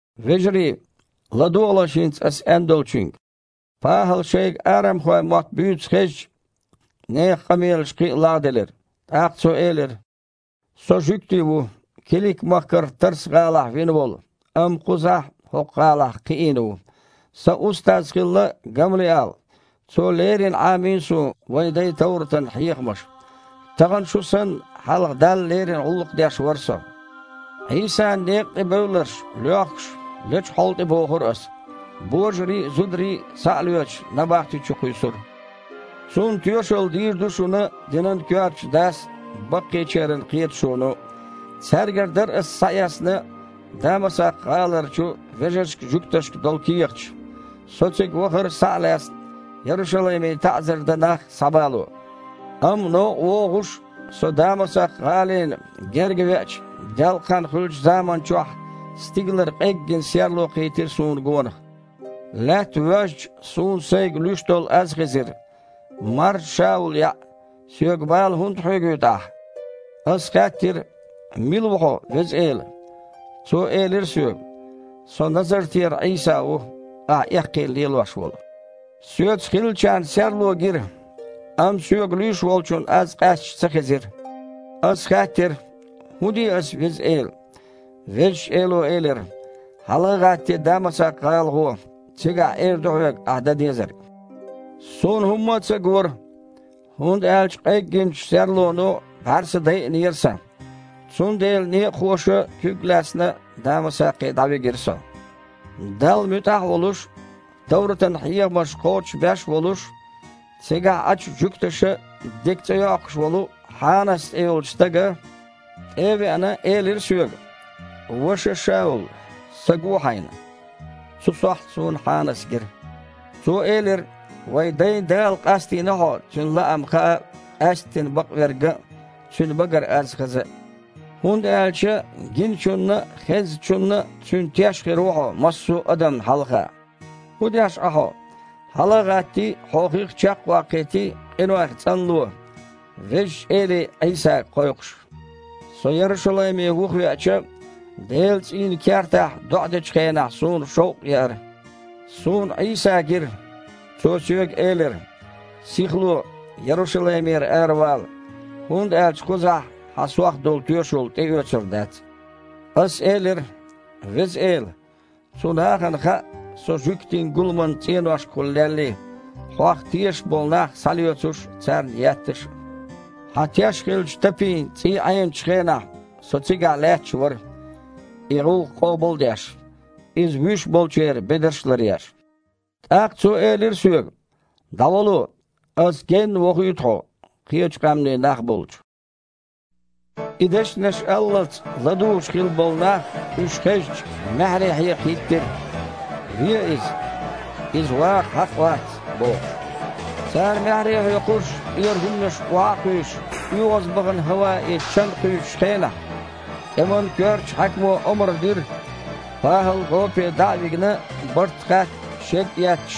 «Вежарий, ладогІалаш хІинца ас аьндолчуьнга». ПахІала шайга арамхойн мотт буьйцу хезча, нехан къамелаш кхин а лагІделира. ТІаккха цо элира: «Со жуьгти ву, Килик-махкара Тарс-гІалахь вина волу, амма кхузахь, хІокху гІалахь, кхиийна ву. Сан устаз хилла Гамлиал. Цо леррина Іамийна суна вайн дайн товратан хьехамаш. Тахана шу санна, хьалха Далла леррина гІуллакх деш вара со. Іийсан некъа тІе бевлларш, лоьхкуш, лечу хьола тІе бохура ас. Божарий а, зударий а, схьа а лоьцуш, набахти чу кхуьйсура. Цунна тоьшалла дийр ду шуна динан коьртачу дас а, баккхийчеран кхеташоно а. Цаьргара дара ас схьаэцна Дамасакх-гІаларчу вежаршка-жуьгташка долу кехаташ. Со цига вахара, схьа а лаьцна, Ярушалайме таІзар дан нах схьабало. Амма новкъа вогІуш, со Дамасакх-гІалина герга веача, делкъахан хуьлучу заманчохь стигалара къеггина серло кхийтира суна гонах. Лаьтта воьжча, суна сайга луьйш долу аз хезира: „Маржа Шаул яІ! Соьга бала хІунда хьоьгуьйту ахь?“ Ас хаьттира: „Мила ву хьо, Веза Эла?“ Цо элира соьга: „Со Назартера Іийса ву, ахь эккхийна лелош волу“. Соьца хиллачарна серло гира, амма соьга луьйш Волчун аз къаьсташ ца хезира. Ас хаьттира: „ХІун де ас, Веза Эла?“ Везачу Эло элира: „Хьала а гІаттий, Дамасакх-гІала гІо, цигахь эр ду хьоьга ахьа дан дезарг“. Суна хІумма а ца гора, хІунда аьлча къеггинчу серлоно бІаьрса дайинера сан. Цундела некъахоша, куьг а лаьцна, Дамасакхе дІавигира со. Далла муьтІахь а волуш, товратан хьехамаш кхочушбеш а волуш, цигахь Іачу жуьгташа дика цІе йоккхуш волу Хьанас цІе йолчу стага, тІе а веана, элира соьга: „Ваша Шаул! Са гуо хьайна!“ Цу сохьта суна Хьанас гира. Цо элира: „Вайн дайн Дала къастийна хьо Цуьнан лаам хаа, къаьсттина Бакъверг ган а, Цуьнан багара аз хаза а. ХІунда аьлча гиначунна а, хезначунна а Цуьнан теш хир ву хьо массо а адамна хьалха. ХІун деш Іа хьо? Хьала а гІаттий, хьо хих чекх а ваккхийтий, къинойх цІанло, Везачу Эле Іийсага кхойкхуш“. Со Ярушалайме вухавеача, Делан цІийнан кертахь доІа дечу хенахь суна шовкъ еара: Суна Іийса гира. Цо соьга элира: „Сихло, Ярушалаймера аравала, хІунда аьлча кхузахь хьан Сох долу тоьшалла тІеоьцур дац“. Ас элира: „Веза Эла, цу нахана хаьа, со жуьгтийн гуламан цІеношкахула леллий, Хьох тешаш болу нах схьалоьцуш а, царна етташ а. Хьан теш хиллачу Тапин цІий Іеначу хенахь со цигахь лаьтташ вара, и гІуллакх къобал а деш, иза вуьш болчеран бедарш а ларъеш“. ТІаккха Цо элира соьга: „ДІавало, Аса генна вохуьйту хьо, кхечи къаьмнийн нах болчу“». И дешнаш аллалц ладугІуш хилла болу нах, уьш хезча, маьхьарий хьекха хІиттира: «Ве иза! Иза ваха хьакъ вац!» – бохуш. Цара маьхьарий а хьоькхуш, тІера хІуманаш охьа а кхуьйсуш, оьгІазбахана хІаваэ чан кхуьйсучу хенахь, тІеман коьртачу хьаькамо омра дира, ПахІал гІопе дІа а вигина, барт хатта, шед а етташ,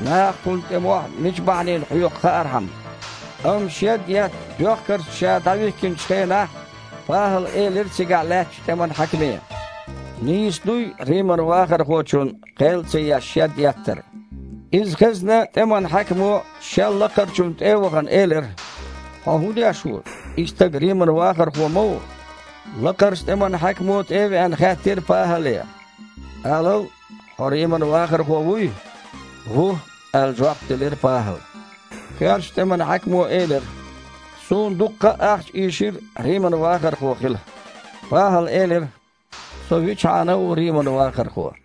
наха кхунна тІе мохь мича бахьанина хьоькху хаархьама. Амма шед етта доьхкаршца ша дІавихкинчу хенахь ПахІала элира цигахь лаьттачу тІеман хьаькаме: «Нийса дуй Риман вахархочунна, кхел а ца еш, шед еттар?» Иза хезна, тІеман хьаькамо, шел лакхарчунна тІе а вахана, элира: «Хьо хІун деш ву? И стаг Риман вахархо ма ву». Лакхарчу тІеман хьаькамо, тІе а веана, хаьттира ПахІале: «Алал, хьо Риман вахархо вуй?» «Ву», – аьлла, жоп делира ПахІала. Коьртачу тІеман хьаькамо элира: «Суна дуккха а ахча ийшира Риман вахархо хила». ПахІала элира: «Со вичхьана а ву Риман вахархо».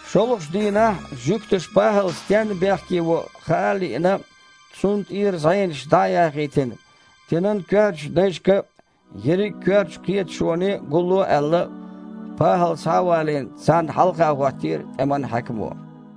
ШолгІачу дийнахь жуьгташа ПахІал стенна бехке во хаа а лиъна, цунна тІера зІенаш дІа а яхийтина, динан коьртачу дайшка а, ерриг а коьртачу кхеташоне а гулло а аьлла, ПахІал, схьа а валийна, царна хьалха хІоттийра тІеман хьаькамо.